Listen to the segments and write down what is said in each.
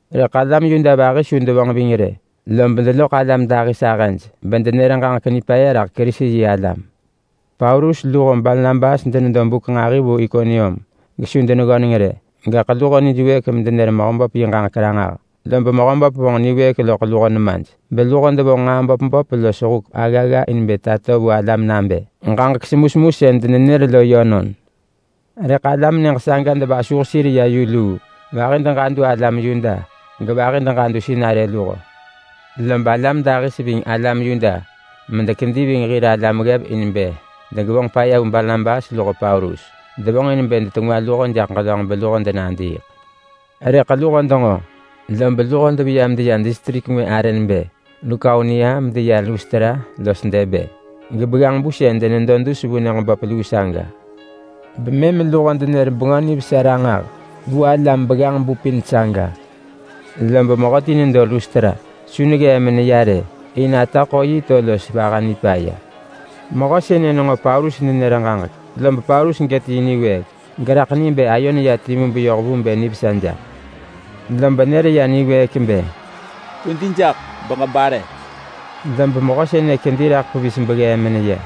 Rëḳ alam Yuda vahi su devonġ ving rë, lob deloḳ alam dahis ahëj bedenër ġaġek nipaya raḳ Kerisi-yi-alam. Paulus luho Barnabas denedo buk nġahi vu Ikonium gesu deneggöneng rë. Gaḳ luho nijwëëk medenër Mehöböp yi ġaġek ranġah, lob Mehöböp vonġ niwëëk loḳ luho nemaj, beluho devonġ nġaa böp böp los huk aggagga in bë tato vu alam nabë ġaġek semusemu sën denenër lo yönon. Rëḳ alam nyëġ saga devasuh sir ya yu luu. Vahi deġadu alam Yuda gevahi deġadu sinarë luho. Lob alam dahis ving alam Yuda medekedi ving hir alam ggev in bë degevonġ paya vu Barnabas luho Paulus. Devonġ in bë dengis luho jaḳ ġelönġ beluho denadiiḳ. Rëḳ luho denġo, lob deveya medeya distrik ngwë arë nebë Lukaonia medeya Lustra los Derbe los begganġ-bu sën denedo dus vu nyëġ böp luu saga. Bemëm luho denër Bengö Nivesa ranġah vu alam begganġ-bu pin saga. Lob mehöti nedo Lustra, su neggee meneya rë, in ata ḳo yi to los vaha nipaya. Mehö sënë nenġo Paulus nenër ġaġek, lob Paulus gët yi niwëëk geraḳ ni bë ayo neya timu beyoh vu bë nivesa jaḳ. Lob nër ya niwëëk bë, “Kwedi jaḳ beġebare!” Lob mehö sënë kedi raḳ pevis beggee meneya.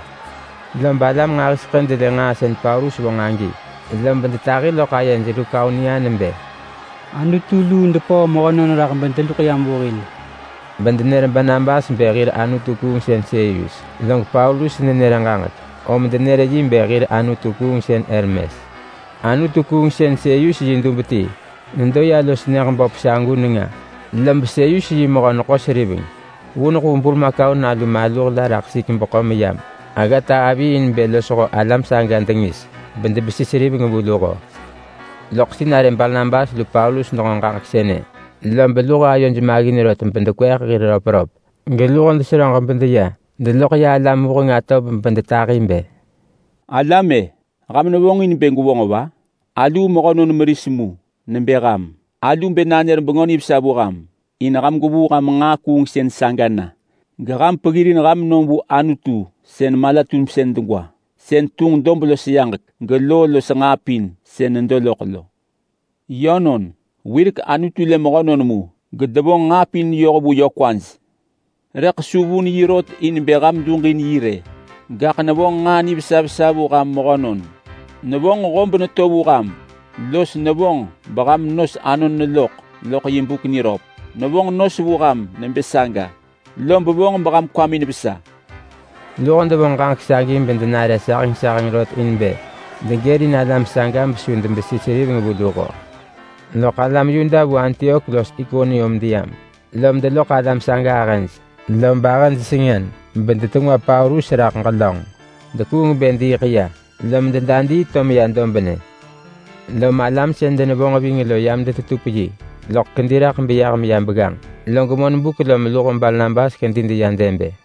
Lob alam nġahiseḳë delë nġaa sën Paulus vonġ agi, lob detahi loḳ ayej Lukaonia nebë, “Anutu luu depöö mehönon raḳ bedeluḳ yam vu hil!” Bedenër Barnabas bë hir anutu-kuungsën Seyus, log Paulus nenër ġaġek, om denër yi bë hir anutu-kuungsën Hermes. Anutu-kuungsën Seyus yi dub ti nedo ya los nyëġ böp sagu nenga, lob Seyus yi mehö-neḳo-seriveng vuneḳ vu burmakau nalu maluh la raḳ sesik beḳo meyam aggata avi in bë losho alam saga dengis bedebesi seriveng vu luho. Loḳ sinarë Barnabas lu Paulus denġo ġaġek sënë, lob luho ayoj maggin rot bedekweeḳ hir röpröp, geluho deseröġ bedeya deloḳ ya alam vuheng atov bedetahi bë, “Alam-e! Ham nevonġin bë gwevonġ va? Aluu mehönon meris mu nebë ham! Alu bë nanër Bengö Nivesa vu ham in ham gwevuu ham nġaa kuungsën saga na geham peggirin ham nom vu Anutu sën mala-tumsën degwa. Sën tunġ dob los yaġek geloo los nġaa pin sën nedo loḳ lo. Yönon, wirek Anutu lë mehönon mu, gedevonġ nġaa pin yoh vu yö kwaj. Rëḳ su vun yi rot in bë ham duġin yi rë. Gaḳ nevonġ nġaa nivesa vesa vu ham mehönon. Nevonġ hob neto vu ham, los nevonġ beham nos anon neloḳ loḳ yi buk niröp. Nevonġ nos vu ham nebë saga, lob vonġ beham kwamin vesa.” Luho devonġ ġaġek sagi bedenare saheng saheng rot in bë degërin alam saga besu debesi seriveng vu luho. Loḳ alam Yuda vu Antiok los Ikonium deyam, lom deloḳ alam saga ahëj, lob ahëj sengën bedetengwa Paulus raḳ ġelönġ. Dekuung bë diiḳ ya, lom dedadii to meya dobnë. Lom alam sën denevonġ ving lo yam detetup yi, rëḳ kedi raḳ beyah meya begganġ. Log monbuk lom luho Barnabas kedi deya Derbe.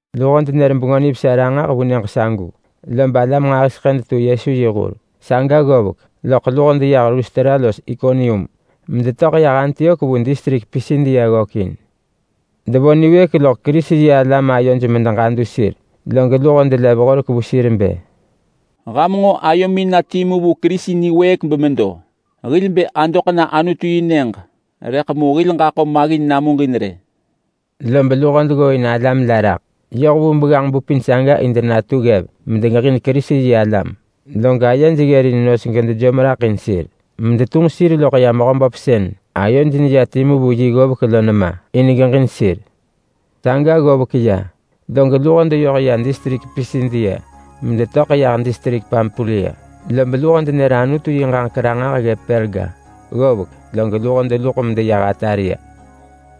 Luho denër Bengö Nivesa ranġah vu nyëġ sagu, lob alam nġahiseḳë detu Yesu yi hur. Saga ggovek loḳ luho deyah Lustra los Ikonium, medetöḳ yah Antiok vu distrik Pisidia ggökin, bedevo niwëëk loḳ Kerisi-yi-alam ayoj medeġadu sir, log luho delev horek vu sir bë, “Ham nġo ayomin na timu vu Kerisi niwëëk bemedo. Hil bë adoḳ na Anutu-yi-nyëġ, rëḳ mu hil ġaḳo maggin namuġin rë.” Lob luho deggooin alam la raḳ yoh vu begganġ-bu pin saga in denatu ggev medegeġin Kerisi-yi-alam, log ayej ggërin nos gedejom raḳ in sir medetunġ sir loḳ ya Mehöböp sën ayoj neya timu vu yi ggovek lo nema in bë geġin sir. Ggovek ya saga log luho deyoh ya distrik Pisidia medetöḳ yah distrik Pampulia, lob luho denër Anutu yi ġaġek ranġah ggëp Perga. Ggovek, log luho deluḳ medeya Atalia.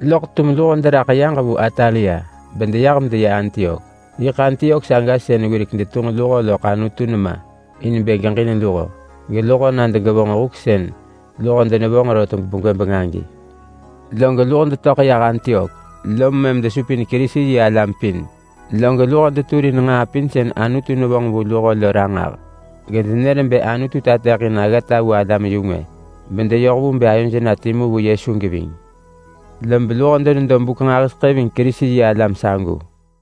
Loḳ tum luho deraḳ yaġ vu Atalia, bedeyah medeya Antiok. Yiḳ Antiok saga sën wirek alam detunġ luho loḳ Anutu nema in bë geġin luho geluho na degevonġ yi huk sën luho denevonġ rot begwëbeng agi. Log luho detöḳ yah Antiok lom mëm desupin Kerisi-yi-alam pin, log luho deturin nġaa pin sën Anutu nevonġ vu luho lo ranġah, gedenër bë Anutu tateḳin aggata vu alam-yu-ngwë bedeyoh vu bë ayoj na timu vu Yesu geving. Lob luho denedo buk nġahiseḳë ving Kerisi-yi-alam sagu.